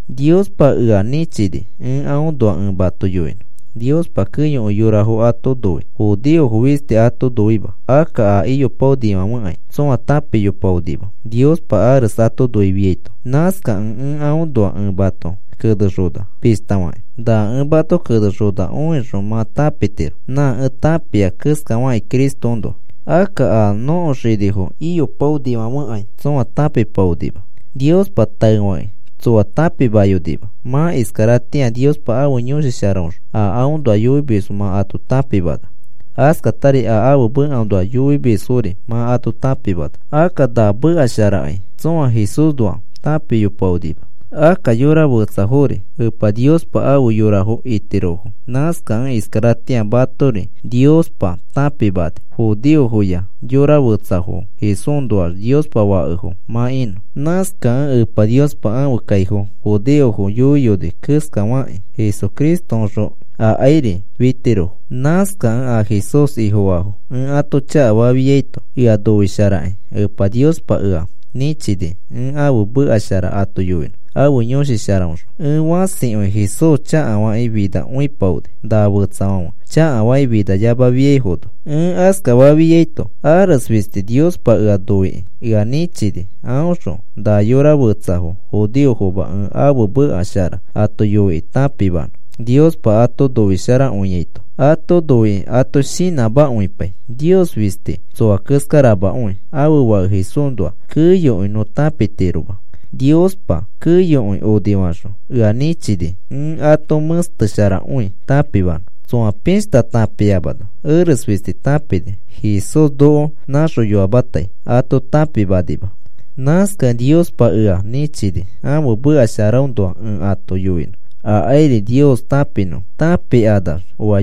Niospa ea nĩchini ẽ aõnoa ẽ mato yoinõ. Niospa keyokõi yorafo ato noi, judeofo fisti ato noima. Akka a iyopaonifãfekai tsõa tãpiyopaonima Niospa ares ato noifiaito. Nãskakẽ ẽ aõnoa ẽ mato kenexona, pishta fakĩ. Na ẽ mato kenexona õixõ, mã tãpitiro nã ẽ tãpia keskafakĩ Cristoõnoa. Akka a nõko xinifo iyopaonifãfekai tsõa tãpipaonima. Niospa taefakĩ tsoa tãpimayonima. Mã iskaratĩa Niospa ãfe Yõshi Sharaõxõ a aõnoa yoimisfo mã ato tãpimana. Askatari a ãfe mekaõnoa yoimisfori mã ato tãpimana. Akka na meka sharakai tsõa Jesúsnoa tãpiyopaonima. Akka yora fetsafori Epa Niospa afe yorafo itirofo. Nãskakẽ iskaratĩa matori Niospa tãpimani, judeofoya yora fetsafo Jesúsnoax Niospa fakefo mã inõ. Nãskakẽ Epa Niospa ãfe kaifo judeofo yoiyoni keskafakĩ Jesucristoõxõ akairi fitirofo. Nãskakẽ a Jesús Ifofaafo ẽ ato chakafafiaito, ea noisharakĩ Epa Niospa ea nĩchini ẽ ãfe meka shara ato yoinõ ãfe Yõshi Sharaõxõ. Ẽ fãsikõi Jesús chakafakĩ finakõipaoni, na fetsafãfe chakafakĩ finayamafiaifono. Ẽ askafafiaito, ares fisti Niospa ea noikĩ ea nĩchini aõxõ na yora fetsafo judeofoma ẽ ãfe meka shara ato yoikĩ tãpimanõ Niospa ato noisharakõiaito. Ato noikĩ ato shinãmakõipai. Nios fisti tsoa keskaramakõi. Ãfe Fake Jesúsnoa keyokõi nõ tãpitiroma. Niospa keyokõi onifaxõ, ea nĩchini ẽ ato mẽstesharakõi tãpimanõ. Tsoa pishta tãpiamano ares fisti tãpini Jesús noko nãxoyoamatai ato tãpimanima. Nãskakẽ Niospa ea nĩchini ãfe meka sharaõnoa ẽ ato yoinõ akairi Nios tãpinõfo. Tãpikanax oa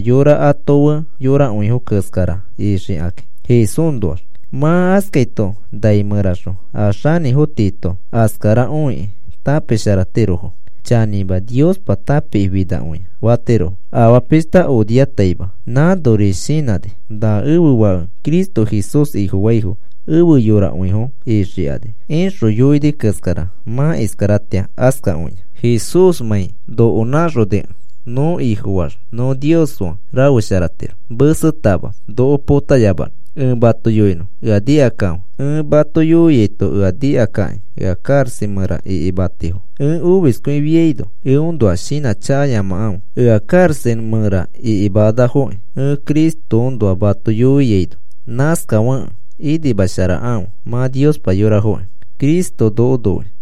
ato fe yorakõifo keskara ixikakĩ Jesúsnoax. Mã askaito nai mẽraxõ a xanĩfo tiito askara õikĩ tãpisharatirofo. “Chanĩma, Niospa tãpikĩfinakõia,” fatirofo. Afaa pishta onifaataima nãnori shinãni: “Na ẽfe Fake Cristo Jesús Ifofaifo efe yorakõifo ixikani,” ixõ yoini keskara mã iskaratĩa askakõia. Jesúsmãi noko nãxonikẽ, nõ Ifofaax, nõ Nios fe rafesharatiro mesetama noko potayamanõ. Ẽ mato yoinõ, ea nikakãfe. Ẽ mato yoiaito ea nikakakĩ ea karaxa mẽra ikimatifo. Ẽ omiskõifiaino eõnoa shinãchakayamakãfe. Ea karaxa mẽra ikimanafoki ẽ Cristoõnoa mato yoiaino. Nãskafekẽ inimasharakãfe, mã Niospa yorafokĩ.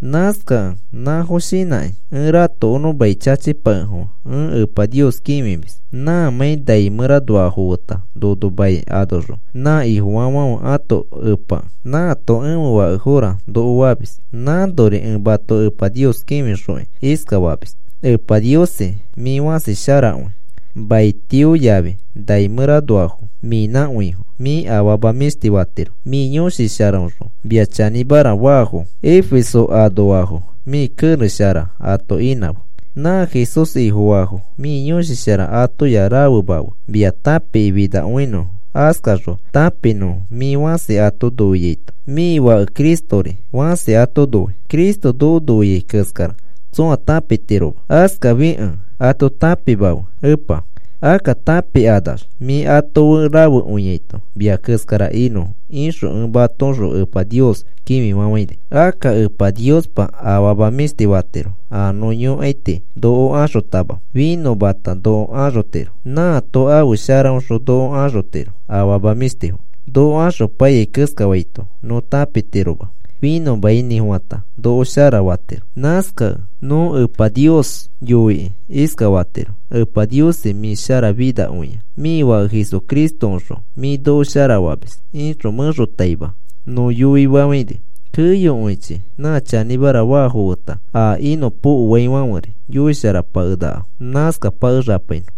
Nãskakẽ nãfo shinãkĩ ẽ ratokonõ mai chachipakefofã ẽ Epa Nios kĩfimis. Nãmãi nai mẽranoafo feta nono mai anoxõ nã Ifofaafãfe ãto Epakẽ, nãato ẽfe fakefora noko famis. Nãnori ẽ mato Epa Nios kĩfixokĩ iskafamis: “Epa Niosi, mĩ fãsi sharakõi. Maitiofo yafi nai mẽranoafo mĩnãkõifo. Mĩ afama mĩshti fatiro. Mĩ Yõshi Sharaõxõ mia chanĩmara faafo Efeso anoafo mĩ kerex shara ato inãfe. Nã Jesús Ifofaafo mĩ Yõshi Shara atoya rafemafe. Mia tãpikĩ finakõinõfo. Askaxõ tãpinõfo mĩ fãsi ato noiaito. Mĩ Fake Cristori fãsi ato noi. Cristo noko noiai keskara tsõa tãpitiroma. Askafikẽ ato tãpimafe, Epa. Akka tãpikanax, mĩ ato fe rafekõiaito mia keskara inõfo,” ixõ ẽ matoõxõ Epa Nios kĩfifafãini. Akka Epa Niospa afama mĩshti fatiro a nõ yõkai tii noko axotama finõmata noko axotiro. Nãato ãfe sharaõxõ noko axotiro afama mĩshtifo. Noko axopaiyai keskafaito nõ tãpitiroma. Finõmainĩfofãta noko shara fatiro. Nãskakẽ nõ Epa Nios yoikĩ iskafatiro: “Epa Niosi, mĩ sharafinakõia. Mĩ Fake Jesucristoõxõ mĩ noko sharafamis,” ixõ mẽxotaima nõ yoifafãini. Keyokõichi nã chanĩmara faafo feta a inõpokoaifãferi yoisharapakenakafo. Nãskapakexapainõ.